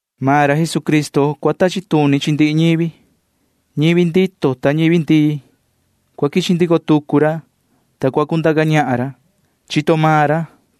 Maan ra Jesucristo cua tachi tuni chi ndihi ñivi―ñivi ndito ta ñivi ndii. Cua quichi ndico tucu ra, ta cua cundaca ñahan ra. Chito maan ra,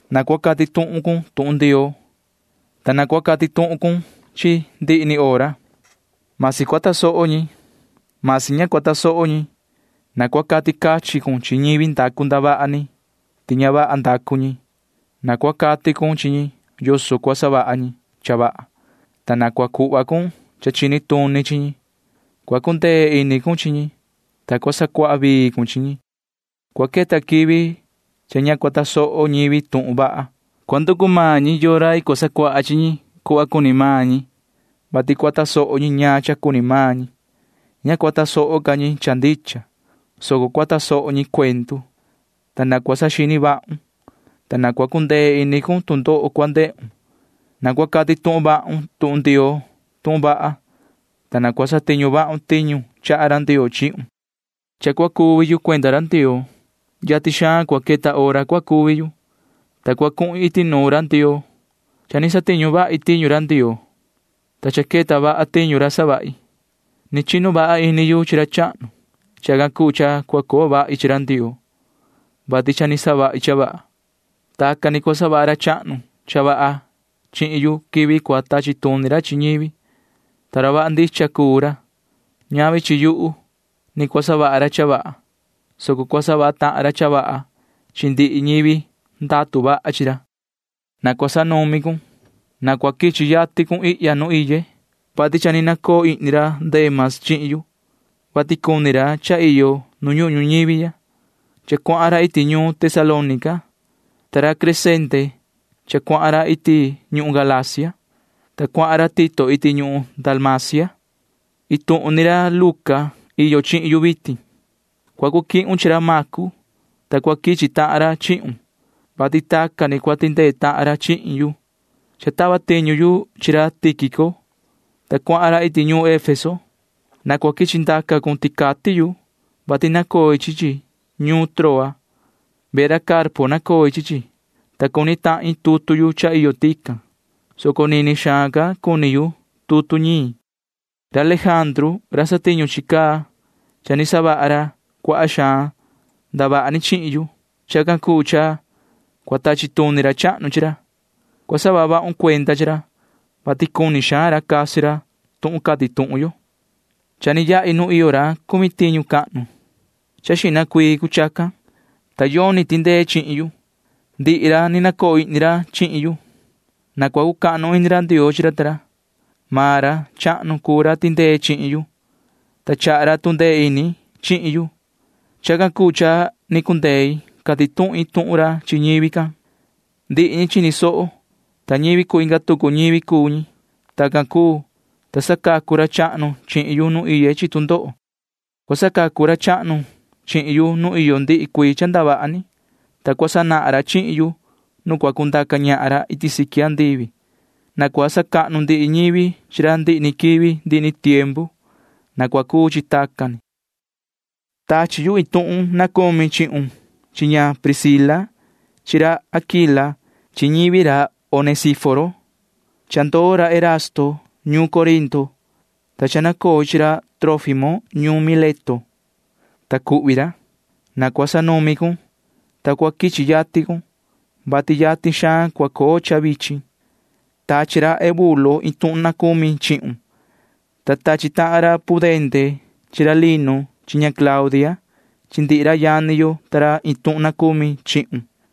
na cua cati tuhun cun tuhun Ndioo, ta na cua cati tuhun cun chi chi ndihi ni hora, masi cua tasoho ñi, masi ña cua tasoho ñi. Na cua cati cachin cun chi ñivi ndacu ndavaha ni ti ña vaha ndacu ñi. Na cua cati cun chi ñi yoso cua savaha ñi cha vaha, ta na cua cuhva cun cha chini tuni chi ñi. Cua cundee ini cun chi ñi, ta cua sacuaha vii cun chi ñi. Cua queta quivi cha ña cua tasoho ñivi tuhun vaha. Cua nducu maan ñi yoo rai cua sacuaha chi ñi cuhva cuni maan ñi, vati cua tasoho ñi ñaan cha cuni maan ñi. Ña cua tasoho ca ñi cha ndicha, soco cua tasoho ñi cuendu. Ta yoho―na cua saxini vahun, ta na cua cundee ini cun tu ndoho cua ndehun. Na cua cati tuhun vahun tuhun Ndioo tuhun vaha, ta na cua satiñu vahun tiñu chaha ra Ndioo chihun. Cha cua cuvi yu cuenda ra Ndioo. Yatin xaan cua queta hora cua cuvi yu, ta cua cuhin iti nuun ra Ndioo. Cha ni satiñu vahi tiñu Ndioo, ta cha queta vaha tiñu ra savahi. Ni chinu vaha ini yu chi ra chahnu. Chacan cuu cha cua coo vahi chi ra Ndioo, vati cha ni savahi cha vaha. Tacan ni cua savaha ra chahnu cha vaha chihin yu quivi cua tachi tuni ra chi ñivi, ta ra vaha ndicha cuu ra. Ñavi chi yuhu ni cua savaha ra cha vaha, soco cua savaha tahan ra cha vaha chi ndihi ñivi ndatu vaha chi ra. Na cua sanumi cun. Na cua quichi yatin cun ihya nu iye, vati cha ni nacoo ihni ra Dema chihin yu, vati cuni ra cha iyo nu ñuhun ñuñivi ya. Cha cuahan ra iti ñuun Tesalónica, ta ra Crescente cha cuahan ra iti ñuhun Galacia, ta cuahan ra Tito iti ñuhun Dalmacia. Iin tuhun ni ra Luca iyo chihin yu vitin. Cua cu quihun chi ra Macu, ta cua quichi tahan ra chihun, vati tacan ni cua tindee tahan ra chihin yu. Cha tava tiñu yu chi ra Tíquico, ta cuahan ra iti ñuun Efeso. Na cua quichi ndaca cun ticati yu, vati nacoi chi chi ñuun Troa. Vehe ra Carpo nacoi chi chi, ta cuni tahin tutu yu cha iyo tican, soco nini xaan ca cuni yu tutu ñiin. Ra Lejandru ra satiñu chi caa―cha ni savaha ra cuaha xaan ndavaha ni chihin yu. Chacan cuu cha cua tachi tuni ra chahnu chi ra. Cua saha vahun cuenda chi ra, vati cuni xaan ra casi ra tuhun cati tuhun yo. Cha ni yahi nuun ra cumi tiñu cahnu. Cha xihna cuii cuu chacan, ta yoni tindee chihin yu. Ndihi ra ni nacoo ihni ra chihin yu. Na cua cucahnu ini ra Ndioo chi ra ta ra. Maan ra chahnu cuu ra tindee chihin yu, ta chaha ra tu ndee ini chihin yu. Chacan cuu cha ni cundei cati tuhin tuhun ra chi ñivi can. Ndihi ñi chini soho, ta ñivi cuu inga tucu ñivi cuu ñi. Tacan cuu, ta sacacu ra chahnu chihin yu nu iye chi tu ndoho. Cua sacacu ra chahnu chihin yu nu iyo ndihi cuii cha ndavaha ni, ta cua sanahan ra chihin yu nu cua cundaca ñahan ra iti siqui andivi. Na cua sacahnu ndihi ñivi chi ra ndihi ni quivi ndihi ni tiempu. Na cua cuu chi tacan ni. Tachi yu iin tuhun na cumi chihun chi ña Priscila chi ra Aquila chi ñivi ra Onesíforo. Cha ndoo ra Erasto ñuun Corinto, ta cha nacoi chi ra Trófimo ñuun Mileto, ta cuhvi ra. Na cua sanumi cun, ta cua quichi yatin cun, vati cha yatin xaan cua coo cha vichin. Tachi ra Eubulo iin tuhun na cumi chihun, ta tachi tahan ra Pudente chi ra Linu chi Claudia chi ndihi ra yani yo ta ra iin tuhun na cumi chihun.